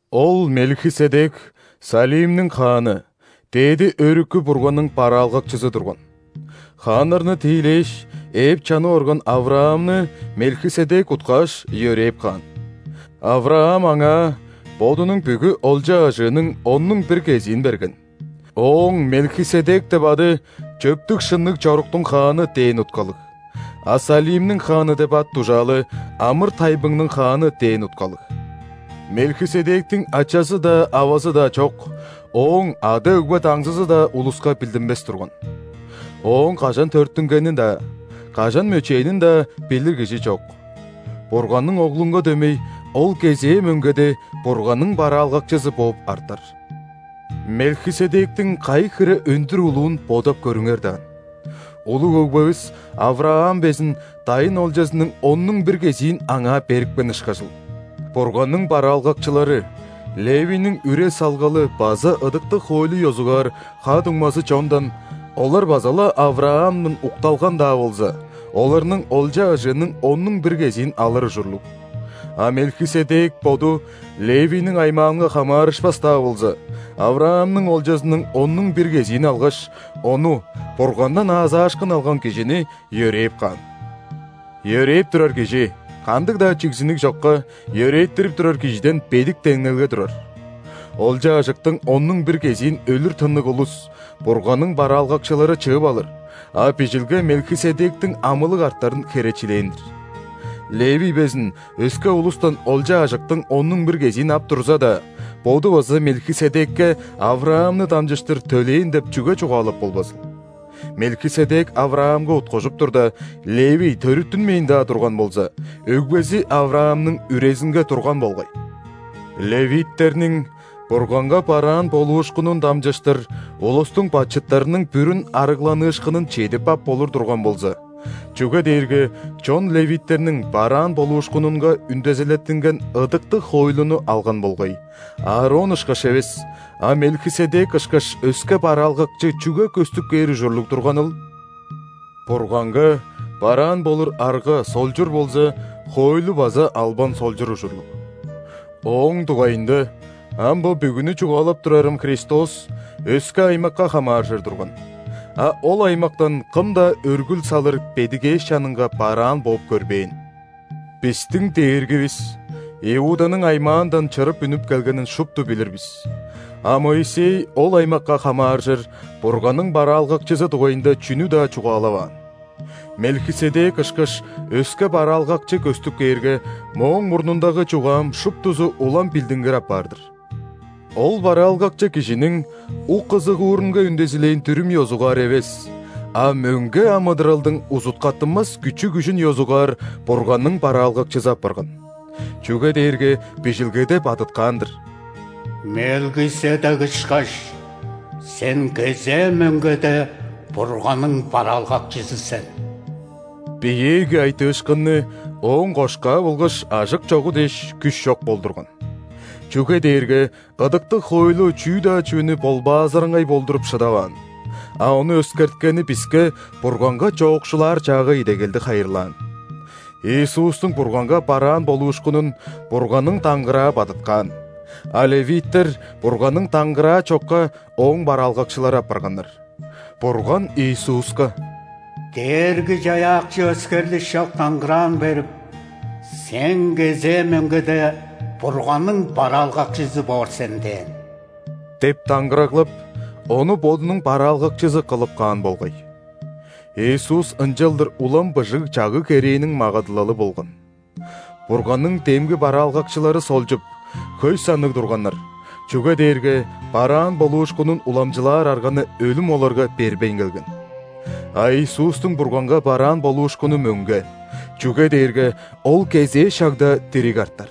Ол Мелхиседек Салимниң хааны, Дээди Өрүкү Бурганның бараалгакчызы турган. Хааннарны тиилээш, ээп чанып орган ·Авраамны Мелхиседек уткааш, йөрээп каан. Авраам аңаа бодунуң бүгү олча-ажыының оннуң бир кезиин берген. Ооң «Мелхиседек» деп ады «Чөптүг-шынныг чоруктуң хааны» дээн уткалыг, а «Салимниң хааны» деп ат-дужаалы «Амыр-тайбыңның хааны» дээн уткалыг. Мелхиседектиң ачазы-даа, авазы-даа чок, ооң ада-өгбе даңзызы-даа улуска билдинмес турган. Ооң кажан төрүттүнгенин-даа, кажан мөчээнин-даа билир кижи чок. Бурганның Оглунга дөмей, ол кезээ мөңгеде Бурганның бараалгакчызы бооп артар. Мелхиседектиң кайы хире өндүр улуун бодап көрүңер даан! Улуг өгбевис Авраам безин дайын олчазының оннуң бир кезиин аңаа берипкен ышкажыл! Бурганның бараалгакчылары – Левийниң үре-салгалы база ыдыктыг хоойлу ёзугаар ха-дуңмазы чондан (олар база-ла Авраамдан укталган-даа болза) оларның олча-ажыының оннуң бир кезиин алыр ужурлуг. А Мелхиседек боду Левийниң аймаанга хамаарышпас-даа болза, Авраамның олчазының оннуң бир кезиин алгаш, ону – Бургандан аазаашкын алган кижини – йөрээп каан. Йөрээп турар кижи кандыг-даа чигзиниг чокка йөрээттирип турар кижиден бедик деңнелге турар. Олча-ажыктың оннуң бир кезиин өлүр тынныг улус – Бурганның бараалгакчылары чыып алыр, а Бижилге Мелхиседектиң амылыг артарын херечилээн-дир. Левий безин өске улустан олча-ажыктың оннуң бир кезиин ап турза-даа, боду база Мелхиседекке Авраамны дамчыштыр төлээн деп чүге чугаалап болбазыл. Мелхиседек Авраамга уткужуп турда, Левий төрүттүнмээн-даа турган болза, өгбези Авраамның үрезинге турган болгай. Левиттерниң Бурганга бараан болуушкунун дамчыштыр улустуң бачыттарының бүрүн арыглаашкынын чедип ап болур турган болза (чүге дээрге чон ·левиттерниң бараан болуушкунунга үндезилеттинген ыдыктыг хоойлуну алган болгай), Аарон ышкаш эвес, а Мелхиседек ышкаш өске бараалгакчы чүге көстүп кээр ужурлуг турганыл? Бурганга бараан болур арга солчур болза, хоойлу база албан солчур ужурлуг. Ооң дугайында ам бо бүгүнү чугаалап турарым Христос өске аймакка хамааржыр турган, а ол аймактан кым-даа өргүл салыр бедигээш чанынга бараан бооп көрбээн. Бистиң Дээргивис Иуданың аймаандан чырып үнүп келгенин шупту билир бис, а Моисей ол аймакка хамааржыр Бурганның бараалгакчызы дугайында чүнү-даа чугаалаваан. Мелхиседек ышкаш өске Бараалгакчы көстүп кээрге, мооң мурнундагы чугаам шуптузу улам билдингир апаар-дыр. Ол Бараалгакчы кижиниң ук-ызыгуурунга үндезилээн дүрүм ёзугаар эвес, а мөңге амыдыралдың узуткаттынмас күчү-күжүн ёзугаар Бурганның бараалгакчызы апарган. Чүге дээрге Бижилгеде бадыткаан-дыр:«Мелхиседек ышкаш, Сен кезээ мөңгеде Бурганның бараалгакчызы сен». Биеэги айтыышкынны ооң кошкаа болгаш ажык чогу дээш, күш чок болдурган. Чүге дээрге ыдыктыг хоойлу чүү-даа чүвени ·болбаазыраңгай болдуруп шыдаваан, а ону өскерткени биске Бурганга чоокшулаар чаагай идегелди хайырлаан. Иисустуң Бурганга бараан болуушкунун Бурганның даңгыраа бадыткаан, а ·левиттер Бурганның даңгыраа чокка Ооң бараалгакчылары апарганнар. Бурган Иисуска: «Дээрги-Чаяакчы өскерлиш чок даңгыраан берип: „Сен кезээ мөңгеде Бурганның бараалгакчызы боор сен“ – дээн» деп даңгыраглап, Ону Бодунуң бараалгакчызы кылып каан болгай. Иисус ынчалдыр улам быжыг чагыг-керээниң магадылалы болган. Бурганның демги бараалгакчылары солчуп, хөй санныг турганнар, чүге дээрге бараан болуушкунун уламчылаар арганы өлүм оларга бербейн келген. А Иисустуң Бурганга бараан болуушкуну мөңге, чүге дээрге Ол кезээ шагда дириг артар.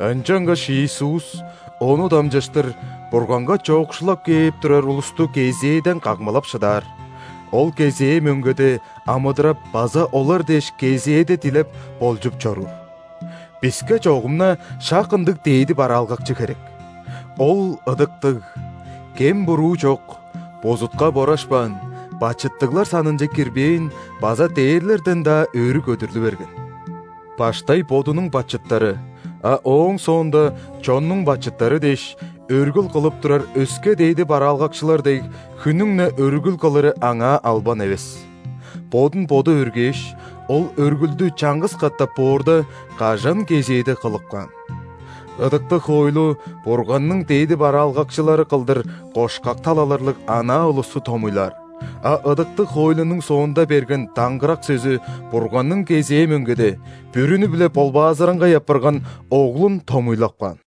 Ынчангаш Иисус Ону дамчыштыр Бурганга чоокшулап кээп турар улусту кезээде камгалап шыдаар, Ол кезээ мөңгеде амыдырап база олар дээш кезээде дилеп, болчуп чоруур. Биске чогум-на шак ындыг дээди бараалгакчы херек. Ол – ыдыктыг, кем-буруу чок, бузутка борашпаан, бачыттыглар санынче кирбээн база дээрлерден-даа өрү көдүрлү берген. Баштай бодунуң бачыттары, а ооң соонда чоннуң бачыттары дээш, өргүл кылып турар өске дээди бараалгакчылар дег, хүннүң-не өргүл кылыры Аңаа албан эвес. Бодун Боду өргээш, Ол өргүлдү чаңгыс катап боорда, кажан кезээде кылып каан. Ыдыктыг хоойлу Бурганның дээди бараалгакчылары кылдыр кошкак талаларлыг анаа улусту томуйлаар, а ыдыктыг хоойлунуң соонда берген даңгырак сөзү Бурганның кезээ мөңгеде, бүрүнү-биле ·болбаазыраңгай апарган Оглун томуйлап каан.